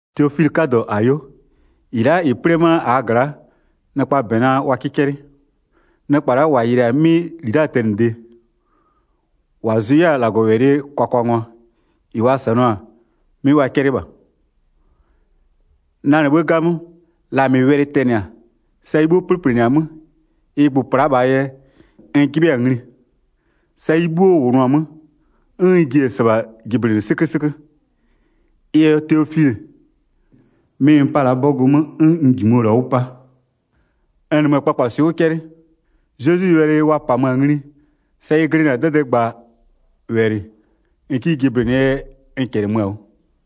Teofilɩ 'kadɔ, -ayo. -Ɩ la'a -ɩ 'plɩ-ɛ ma'a -aa gla'a, nɩkpaa -bɛ nɛ wa 'kɩ 'cɛlɩ. Nɩkpa la'a -wa yɩlɩ-a 'mɩ -li la'aa tɛnɩde, -wa zʋ 'yɛ-a -Lagɔwɛlɩɛ kwakwangwa-a, -ɩ wa -sanʋa-a 'mɩ wa 'cɛlɩ -bha. Na -nɩ 'bhë 'gamö, la 'mɩ wɛlɩ tɛnɩ-a, sa ɩ 'bhuo 'plɩplɩnɩ-a 'mö, ɩ gbʋ-ʋ pla'a -bhaa yɛ n 'jɩbhɩ-a ngli, sa ɩ 'bhuo -wʋnʋ-a 'mö, 'n n ji-e -sɩbha jɩblɩnɩ 'sɩkösɩkö. Ɩ yɛ Teofilɩ, 'mɩ n 'pa-a la'a 'bɔgʋ 'mö 'n n -jimʋ-ɔ -la 'wʋ 'pa. N -nɩmö-ö kpakpaswɩ'ɩ 'wʋ 'cɛlɩ, Zezwie wɛlɩ wa -pamö-a ngli sa ɩ glɩnɩ-a 'dɛdɛɛgbawɛlɩ -n 'kɩ jɩblɩnɩɛ yɛ n -cɛlɩmö-a 'wʋ.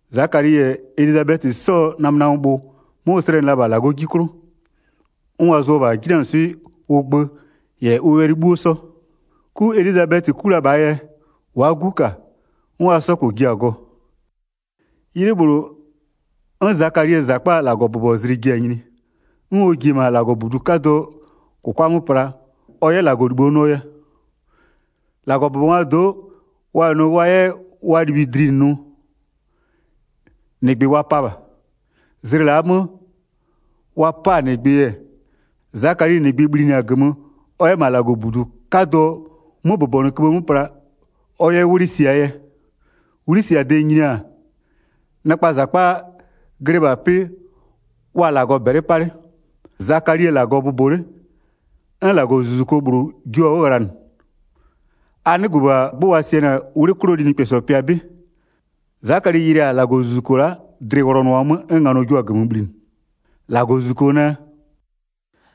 Zakali -yɛ Elizabɛtɩ 'sɔɔ namönamöbhʋ 'mö ʋ slɛnɩ la-a -bha -Lagɔɔ 'ji 'klʋ, 'n wa zʋ-ɔ -bha 'jinanɩswɩ'ɩ ʋ gbö -yɛ ʋ wɛlɩ 'bhuo 'sɔ. 'Ku Elizabɛtɩ 'ku la -bhaa yɛ, wa'a 'gu -ka 'n wa 'sɔ -kpɔ ji-a gɔ. 'Ylɩ -bhlʋ, 'n Zakalie -zakpaa -Lagɔbʋbɔzlɩ ji-a nyini, 'n ɔ ji-e -ma -Lagɔbudu 'kadʋɔ -kʋkwa 'mö pla ɔ 'yɛ -Lagɔlibho nʋɔ yɛ. 9-Lagɔbʋbɔngwaa do'o wa -yɛ nʋ wa 'yɛ wa libhui dlinɩ nʋ, -nɩgbɩ wa pa -bha. Zlɩ la'aa 'mö wa 'pa-a -nɩgbɩ-ɛ, Zakali -nɩgbɩ bhlinɩ-a -gömö ɔ 'yɛ -ma -Lagɔbudu 'kadʋɔ 'möbʋbɔnʋköbhë 'mö pla, ɔ 'yɛ 'wlɩ siaa 'yɛ. 'Wlɩsiade nyini-a, nɩkpaa -zakpa glɩ -ma 'pɩ wa-a -Lagɔ -bɛlɩ 'pa 'le, Zakali-e -Lagɔ bʋbɔ 'le, 'n -Lagɔzuzuko -bhlʋ jio-a 'wʋ ghlanɩ. A 'nɩgbö -bha 'gbʋ wa sianɩ-a 'wlɩ 'klʋɔ linɩkpɛsɔ pɩa 'bɩ. Zakali yɩlɩ-a -Lagɔzuzuko la'a, dlɩ-ɩ wlɔnʋɔ-a 'mö 'n nganɔ jio-a -gömö bhlinɩ. 13-Lagɔzuzuko nɛ: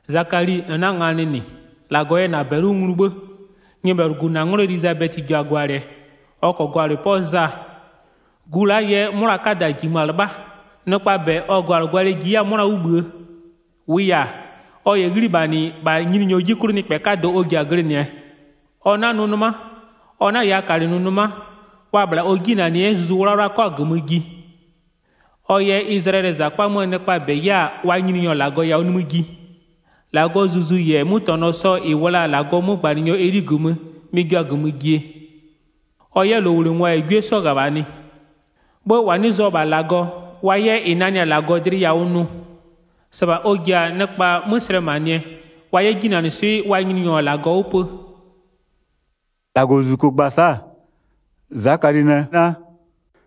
“Zakali -n 'na-a nganɩ -nɩ, -Lagɔ yɛ -na -bɛlɩ 'wʋ nglu 'bhë. Nyɩbhɛlʋgu -na 'nglɔ Elizabɛtɩ ji-a gwalɩɛ. Ɔ -kɔɔ gwalɩ 'pɔ Za. Gu la'aa yɛ 'mʋna 'kada -jimö-a 'lɩbha, nɩkpaa -bɛ ɔ gwalɩgwalɩɛ ji 'yɛ-a 'mʋna 'wʋ -bhïë. 15-Wʋʋ yɛ-a, ɔ -yɛ 'ghlimanɩ -bha Nyininyɔ 'ji 'klʋ nɩkpɛ 'kadɔ ɔ ji-a glɩnɩɛ, ɔ 'na nʋ 'nɩma, ɔ 'na -yaakalɩnʋ 'nɩma, wa-a -bhla ɔ 'jinanɩyɛ, 'n Zuzu 'Wlawla 'kɔ-a -gömö ji. Ɔ yɛ Izlayɛlɩɛ -zakpa 'möö nɩkpaa -bɛ 'yɛ-a wa Nyininyɔ -Lagɔ yawʋ nimï ji. 17-Lagɔɔ Zuzu -yɛ 'mötɛnɔ sɔ -ɩ -wʋ la-a -Lagɔɔ 'mögbanɩnyɔ Eli -gömö, mɩ-ɩ jio-a -gömö jie, ɔ 'yɛ -lowlengwa -yɛ 'gwie 'sɔ -ghöbhanɩ, 'bhë -wa 'nɩ zʋ-ɔ -bha -Lagɔ, wa 'yɛ -ɩ nanɩ-a -Lagɔ dlɩ yawʋ nʋ. -Sɩbha ɔ ji-a nɩkpa 'mö slɛmanɩɛ, wa 'yɛ 'jinanɩswɩ'ɩ wa Nyininyɔ -Lagɔ 'wʋ pö.” 18-Lagɔzuzuko gba-a sa'a, Zakali nɛ naa: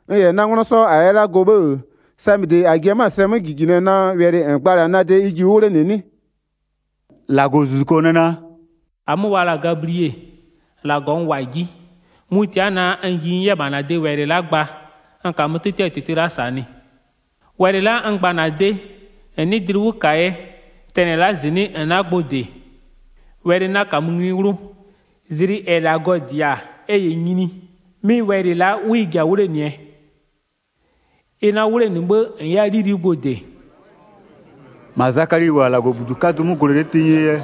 “N -yɛ na 'nglɔ 'sɔ -a yɛ la'a gɔ 'bhë-ë, samɩde n ji-a sɛ 'mö -jijinɩɛ naa, wɛlɩ -n gba-a la'a na de ji 'wʋ 'wlenɩ 'nɩ?” 19-Lagɔzuzuko nɛ naa: “-Amö wa la-a Gablie, -Lagɔ n -wʋ-a 'ji, mʋ-ʋ tia'a-a naa, n ji n 'yɛ -bha -na de wɛlɩ la'a gba n -kamö 'tɩtɩɛ -tɩtɩ la'a -sanɩ. Wɛlɩ la'a n gba-a -na de, -n 'nɩɩ dlɩ 'wʋ -kaa yɛ, tɛnɩ la'a -zɩnɩ'ɩ -n 'na gbʋ -dɩ, wɛlɩ 'na -kamö ngli 'wlʋ, zlɩ -ɛ -Lagɔ -dɩ-a ɛ -yɛ nyini, 'mɩ wɛlɩ la'a 'wʋ ɩ ji-a 'wlenɩɛ. Ɩ 'na 'wʋ 'wlenɩ 'bhë, -n 'yɛ-a 'lili'i gbʋ -dɩ.” 21-Ma Zakali -wʋ-a -Lagɔbudu 'kadʋ 'mö gwlɛ 'le tenyie yɛ,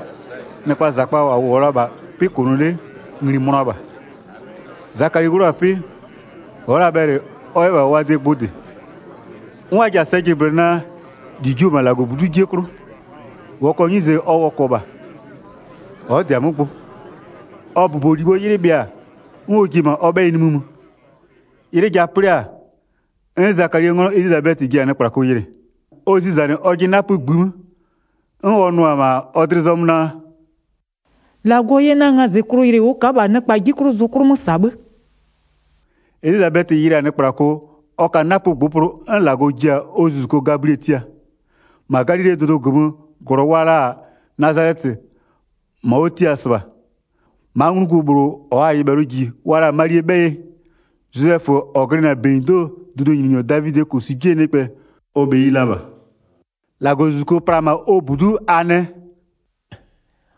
nɩkpaa -zakpa -wa -wʋɔ la-a -ma 'pɩ -kʋnʋ 'le ngli-i mönʋa -bha. Zakali 'wlʋ-a 'pɩ, ɔ'ɔ la bhɛlɩ ɔ 'yɛ -bha wa de gbʋ -dɩ. 'N wa ji-a sɛ jɩblɩnɩ naa, -li jio-o -ma -Lagɔbudu'u 'jie 'klʋ. Wɔkɔɔ 'nyize ɔ wɔkɔ -bha, ɔ'ɔ -dɩ-a 'mö gbʋ. Ɔ bʋbɔlibhoo 'ylɩ bhɩa-a, 'n ɔ ji-e -ma ɔ 'bhɛyɩ nimï mö. 'Ylɩ ja 'plɩ-a, 'n Zakalie 'nglɔ Elizabɛtɩ ji-a nɩkplako yɩlɩ. Ɔ zizanɩ ɔjɩ 'napö -ngbï 'mö, 'n ɔ nʋ-ɔ -ma ɔ dlɩ zɔmö naa: “-Lagɔ yɛ na ngazɩklʋ yɩlɩ ʋ ka'a -bha nɩkpa 'ji 'klʋ zʋ 'klʋ 'mö -sa 'bhë.” Elizabɛtɩ yɩlɩ-a nɩkplako, ɔ ka 'napö -ngbʋpʋlʋ 'n -Lagɔ ji-a ʋ zuzuko Gablie tia. Ma Galilee dʋdʋ -gömö -glɔ wa la-a Nazalɛtɩ -ma ʋ tiaa-a -sɩbha, 27-ma nglugu -bhlʋ -ɔɔ-a nyɩbhɛlʋ -ji wa la-a Malie 'bhɛyɩ. Zozɛfö, -ɔ glɩnɩ-a -benyido'oo dʋdʋnyininyɔ Davidɩɛ -kosu 'jie nɩkpɛ, ɔ bheyi la -bha. 28-Lagɔzuzuko pla-a -ma ɔ -budu'u a nɛ: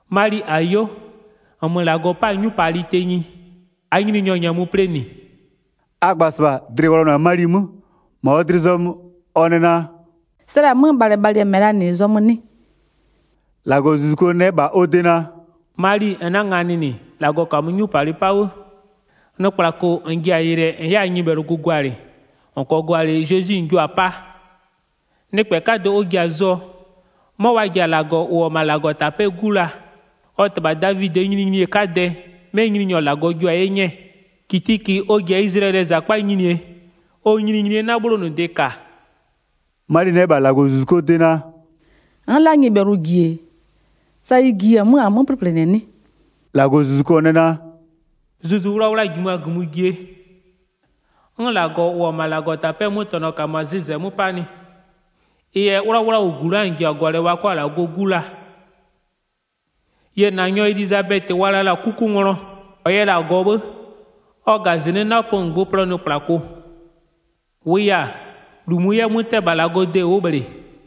“Mali, -ayo -nmö -Lagɔ 'pa-a 'nyupalɩ tenyi, -aa Nyininyɔ -nyɛmö plɩnɩ.” A gba-a -sɩbha dlɩ wlɔnʋ-a Mali 'mö, -ma ɔ dlɩ zɔmö ɔ nɛ naa: “Slɛ-a 'mö bhalɩbhalɩɛ -mɛ -laa -nɩ zɔmö 'nɩ?” 30-Lagɔzuzuko nɛ -bha ɔ de naa: “Mali -n 'na-a nganɩ -nɩ, -Lagɔ -kamö 'nyupalɩ 'pa 'bhë. Nɩkplako -n ji-a yɩlɩɛ -n 'yɛ-a nyɩbhɛlʋgu gwalɩ, -n -kɔɔ gwalɩ, Zezwi -n jio-a 'paa. Nɩkpɛ 'kadɔ ɔ ji-a zʋɔ, 'mɔ wa ji-a -Lagɔ -ʋ -wʋ-ɔ -ma -Lagɔtapɛ'ɛɛ 'Gu laa. Ɔ -tɩbha Davidɩɛ nyininyinie 'kadɛ 'mɛ Nyininyɔ -Lagɔ jio-a 'ye 'nyɛɛ. 33-Kitiki ɔ ji-a Izlayɛlɩɛ -zakpa nyinie, ɔ nyininyinie 'na 'bhlonʋde -ka.” Mali nɛ -bha -Lagɔzuzukoo de naa: “N'n la'a nyɩbhɛlʋ -ji-e, sa ɩ ji-e 'mö-a 'mö 'plɩplɩnɩɛ 'nɩ?” 35-Lagɔzuzuko nɛ naa: “Zuzu Wlawla-a -jimö-a -gömö jie, 'n -Lagɔ -ʋ -wʋ-ɔ -ma -Lagɔtapɛ'ɛɛ 'mötɛnɔ -kamö-a zɩzɛ 'mö 'panɩ. Ɩ yɛ 'wlawlawʋgu la'a -n ji-a gwalɩɛ wa 'kɔ-a -Lagɔɔ 'Gu la. Yie -na nyɔ Elizabɛtɩ, -ɔ wa la la-a 'kukunglɔ, -ɔ yɛ la-a gɔ 'bhë, ɔ -ga -zɩnɩ'ɩ 'napö -ngbʋpʋlʋɔ nɩkplako. 37-Wʋʋ yɛ-a, -lu -mʋ 'yɛ 'mö 'tɛ-ɛ -bha -Lagɔɔ de ʋ'ʋ -bhlɩ.”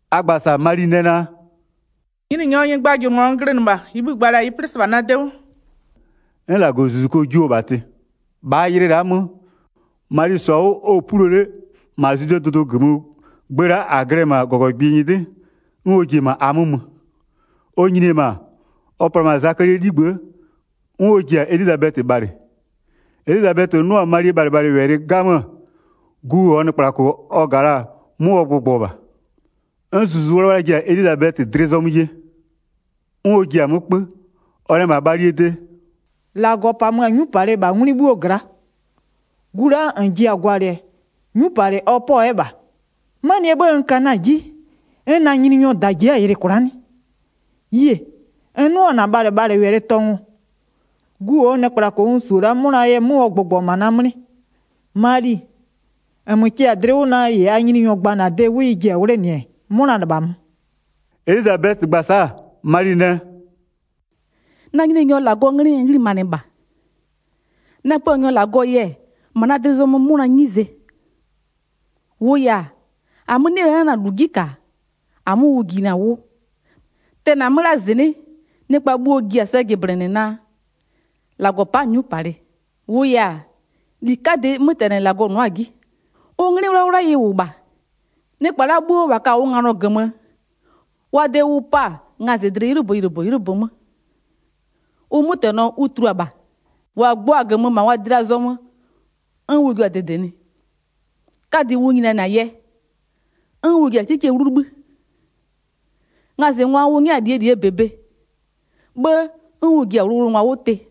A gba-a sa'a Mali nɛ naa: “Nyininyɔɔ nyɩgbajʋlʋnglɔ n glɩnɩ -bha. -Ɩɩ bhï -n gba-a -la ɩ 'plɩ -sɩbha na de 'wʋ.” 'N -Lagɔzuzuko jio-o -bha tɩ. Mali yɛ Elizabɛtɩ yɩlɩ kwla'a mö 39-Bhaa ylɩ la'aa 'mö, Mali -sɔ-a 'wʋ, ɔ-ɔ pulo 'le, -ma Zwidee dʋdʋ -gömöö gbë la'a -a glɩ-ɛ -ma -gɔgɔgbɩ nyɩdɩ, 'n ɔ ji-e -ma a 'mö mö. Ɔ nyini-e -ma, ɔ pla-a -ma Zakalie 'ligbë'ë 'n ɔ ji-a Elizabɛtɩ bhalɩ. Elizabɛtɩ 'nʋ-a Malie bhalɩbhalɩwɛlɩ 'gamö, gu -ɔɔ nɩkplako ɔ -ga la-a 'mö ɔ gbʋgbɔ -bha. 'N Zuzu 'Wlawla ji-a Elizabɛtɩ dlɩ zɔmö ye. 'N ɔ ji-a 'mö 'kpö, ɔ nɛ -bha Malie de: “-Lagɔ -pamö-a 'nyupalɩ -ma 'ngwlɩ 'bhuo gla'a. Gu la'a -n ji-a gwalɩɛ 'nyupalɩ ɔ 'pɔ-ɔ 'yɛ -bha. 'Manɩɛ 'bhë n ka na-a 'ji 'n na Nyininyɔɔ -da ji'i-a yɩlɩ kwla'a 'nɩ? Yie, n 'nʋ-ɔ -na bhalɩbhalɩwɛlɩ tɔngʋ, gu -ɔɔ nɩkplako n -su-o la'a 'mʋnaa yɛ 'mö ɔ gbʋgbɔ-a -ma na 'mlɩ. Mali, -nmö kɩ-a dlɩ 'wʋ naa, -ɩ -aa Nyininyɔ gba-a -na de 'wʋ ɩ ji-a 'wlenɩɛ, 'mʋna -lɩbhamö.” Elizabɛtɩ gba-a sa'a, Mali nɛ: “Na Nyininyɔ -Lagɔɔ 'nglɩ n 'ghlimanɩ -bha. Na Puanyɔ -Lagɔɔ yɛ, -ma na dlɩ zɔmö 'mʋnaa 'nyize. 48-Wʋʋ yɛ-a, -amö 'nɩ-ɛ la'a na-a -lu 'ji -ka -amö ʋ jinɩ-a 'wʋ. Tɛnɩ-a 'mö la'a -zɩnɩ'ɩ, nɩkpa bhuo-o ji-a sɛ jɩblɩnɩɛ naa -Lagɔ pa'a-a 'nyupalɩ. 49-Wʋʋ yɛ-a, -li 'kadɩ 'mötɛnɩ -Lagɔ nʋ'ʋ-a 'ji. Ʋ 'nglɩ 'wlawla ɩ -wʋ -bha. Nɩkpa la'a 'bhuo -wa ka-a ʋ nganɔ -gömö, wa de ʋ pa-a ngazɩdlɩ 'ylʋbö -ylʋbö 'ylʋbö 'mö. Ʋ 'mötɛnɔ ʋ tulua-a -bha, -wa gbɔ-a -gömö -ma wa dlɩ-a zɔmö 'n ʋ jua-a -dɩdɩnɩ. 'Kadɩ ʋ nyinianɩ-a yɛ, 'n ʋ ji-a 'kikie 'wlu 'libhï. Ngazɩngwa ʋ 'nyɛ-a -lie -lie -bebe, 'bhë 'n ʋ ji-a wʋlʋwʋlʋngwa 'wʋ tɩ.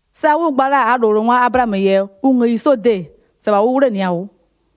Sa ʋ gba la-a -aa -lowlengwa Ablaamö -yɛ ɔ ngëyi 'sɔɔ de, -sɩbha ʋ 'wlenɩɩ-a 'wʋ.”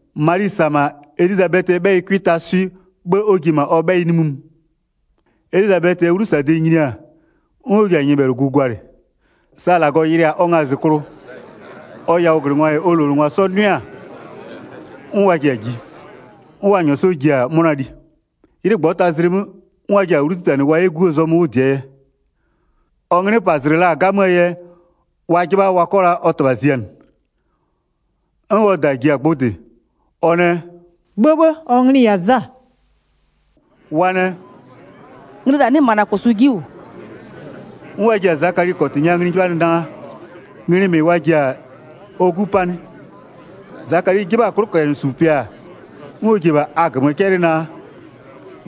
Mali -sa-a -ma Elizabɛtɩɛ 'bhɛyɩ 'cʋɩ taa swɩ, 'bhë 'n ɔ ji-e -ma ɔ 'bhɛyɩ nimï mö. Elizabɛtɩɛ 'wlusade nyini-a, 'n ɔ ji-a nyɩbhɛlʋgu gwalɩ. Sa -Lagɔ yɩlɩ-a ɔ ngazɩklʋ, ɔ yawʋglɩngwa -yɛ ɔ -lowlengwa 'sɔ 'nʋɩ-a, 'n wa ji-a ji, 'n wa -nyɔɔ 'sɔ ji-a 'mʋna li. 'Ylɩ -ngbɔtazlɩ 'mö, 'n wa ji-a 'wlu 'titanɩ wa 'yɛ 'guo zɔmö 'wʋ -dɩɛ yɛ. Ɔ 'nglɩpazlɩ la-a 'gamöö yɛ wa 'jɩbha wa 'kɔ la ɔ -tɩbha zianɩ. 'N ɔ -da ji-a gbʋ -dɩ, ɔ nɛ: “'Bhëbhë, ɔ nglɩ-ɩ yɛ-a Za.” Wa nɛ: “Nglɩ -la 'nɩ -ma -na -kosu 'ji -wʋ.” 'N wa ji-a Zakali -kɔtɩ nya ngli 'jɩbhanɩ naa, nglɩ -mɩ wa ji-a ɔ 'gu 'paa 'nɩ? Zakali 'jɩbha-a 'klʋcɛlɩsupɩa, 'n ɔ ji-e -bha a -gömö 'cɛlɩ naa: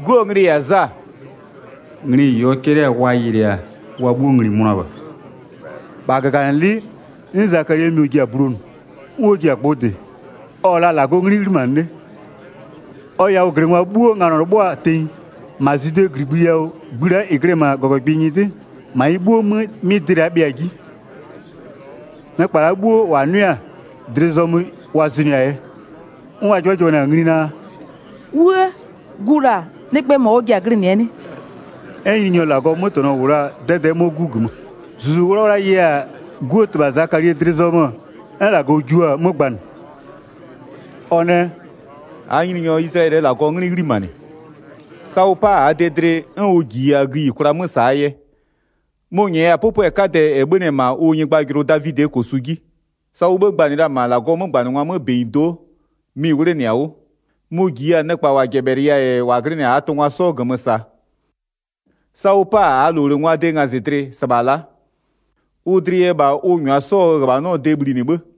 “'Guo nglɩ-ɩ -yɛ-a Za.” Nglɩ -ɩ ɔ 'cɛlɩ-a wa yɩlɩɩ-a, wa 'bhuo ngli-i mönʋa -bha. 64-Bha -gaganɩlɩ'ɩ, 'n Zakalie mɩɔ ji-a bulonʋ, 'n ɔ ji-a gbʋ -dɩ, ɔ-ɔ la'a -Lagɔɔ 'nglɩ 'ghlimanɩ 'le. Ɔ yawʋglɩngwa 'bhuo nganɔ 'lɩbhʋa-a tenyi, -ma Zwidee -gligbï yawʋ gbï la'a -ɩ glɩ-ɛ -ma -gɔgɔgbɩ nyɩdɩ, -ma ɩ 'bhuo 'mö 'mɩ dɩ la'a bhɩa-a 'ji. Nɩkpa la'a 'bhuo -wa 'nʋɩ-a, dlɩ zɔmö wa zʋnʋɩ-a yɛ, 'n wa 'jɩbhajɩbhanɩ-a ngli naa: “'Wuë! Gu -la nɩkpɛɛ -mɔ ɔ ji-a glɩnɩ-ɛ 'nɩ?” 'N Nyininyɔ -Lagɔɔ 'mötɛnɔ -wʋ la-a 'dɛdɛ'ɛ 'mɔ 'gu -gömö. Zuzu 'Wlawla ye-a 'guo -tɩbha Zakalie dlɩ zɔmö 'n -Lagɔ jio-a 'mö gbanɩ. Ɔ nɛ: “-Aa Nyininyɔ Izlayɛlɩɛ -Lagɔɔ 'nglɩ 'ghlimanɩ. Sa ʋ 'pa-a -aa de dlɩ 'n ʋ -jiya-a gïyikwla 'mö -saa yɛ. Mʋ-ʋ -nyɛya-a 'pʋpʋɛ 'kadɛ -ɛ 'bhönɩ-ɛ -ma ʋ nyɩgbajʋlʋ Davidɩɛ -kosu 'ji. Sa ʋ 'bhë gbanɩɩ la-a -ma -Lagɔɔ 'mögbanɩngwa 'mö -benyido'o, mɩ-ɩ 'wlenɩ-a 'wʋ. Mʋ-ʋ -jiya-a nɩkpa -wa -jɛbhɛlɩya-a -yɛ -wa glɩnɩ-a -aa tʋngwa 'sɔ -gömö -saa. Sa ʋ 'pa-a -aa -lowlengwaa de ngazɩdlɩ -sɩbha la'a. Ʋ dlɩ yɛ -bha ʋ -nyʋa 'sɔɔ -ghöbhanɔɔ de -bhlinɩ 'bhë.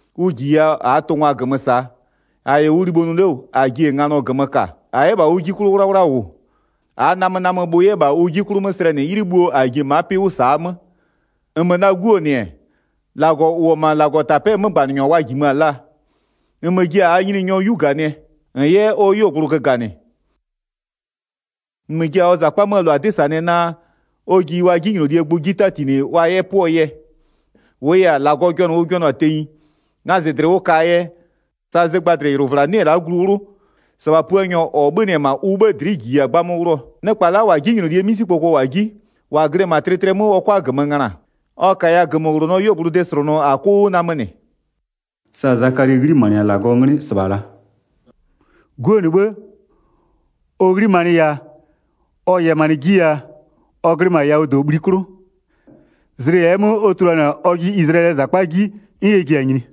Ʋ -jiya -aa tʋngwa -gömö -sa, -a -yɛ ʋ libho nʋ 'le -wʋ -a ji-e nganɔ -gömö -ka. 75-A 'yɛ -bha ʋ 'ji 'klʋ 'wlawla -wʋ, -aa namönamöbhʋ 'yɛ -bha ʋ 'ji 'klʋ 'mö slɛnɩ 'ylɩ bhuo -a ji-e ma'a 'pɩ 'wʋ -saa 'mö. 76-Nmö na 'guo -nɩ-ɛ, -Lagɔ -ʋ -wʋ-ɔ -ma -Lagɔtapɛ'ɛɛ 'mögbanɩnyɔ wa -jimö-a laa. -Nmö ji-a -aa Nyininyɔ 'yu -ganɩɛ, -n 'yɛ ɔ 'yuogblʋ göganɩ. 77-Nmö ji-a ɔ -zakpa 'möö -lʋa 'dɩ -sanɩɛ naa, ɔ ji wa 'jinylolie gbʋ 'ji 'tatinɩ wa 'yɛ 'pʋɔ yɛ. 78-Wʋʋ yɛ-a, -Lagɔ jɔnʋ ʋ jɔnʋ-a tenyi, ngazɩdlɩ ʋ ka-aa yɛ, sa zɩgbadlɩylʋvla 'nɩ-ɛ la'a glu 'wlʋ, -sɩbha Puanyɔ -ɔ 'bhönɩ-ɛ -ma ʋ 'bhë dlɩ'ɩ -jiya-a 'gbamö 'wlʋɔ. 79Nɩkpa la'a -wa 'jinylolie 'misikpoko -wʋ-a 'ji, -wa glɩ-ɛ -ma tlɩtlɩɛ 'mö ɔ 'kʋa -gömö ngöna. Ɔ -kaya -gömöwlonɔɔ 'yuogblʋ de -slʋnʋ a 'kʋ 'wʋ namönɩ.” Sa Zakali 'ghlimanɩ-a -Lagɔɔ 'nglɩ -sɩbha -la. 80'Guo -nɩ 'bhë, ɔ 'ghlimanɩ yaa, ɔ yɛmanɩ 'ji yaa, ɔ glɩ -ma yawʋdobhli 'klʋ, zlɩ -ɛɛ 'mö ɔ tuluanɩ-a ɔjɩ Izlayɛlɩɛ -zakpa 'ji 'n ɛ ji-a nyini.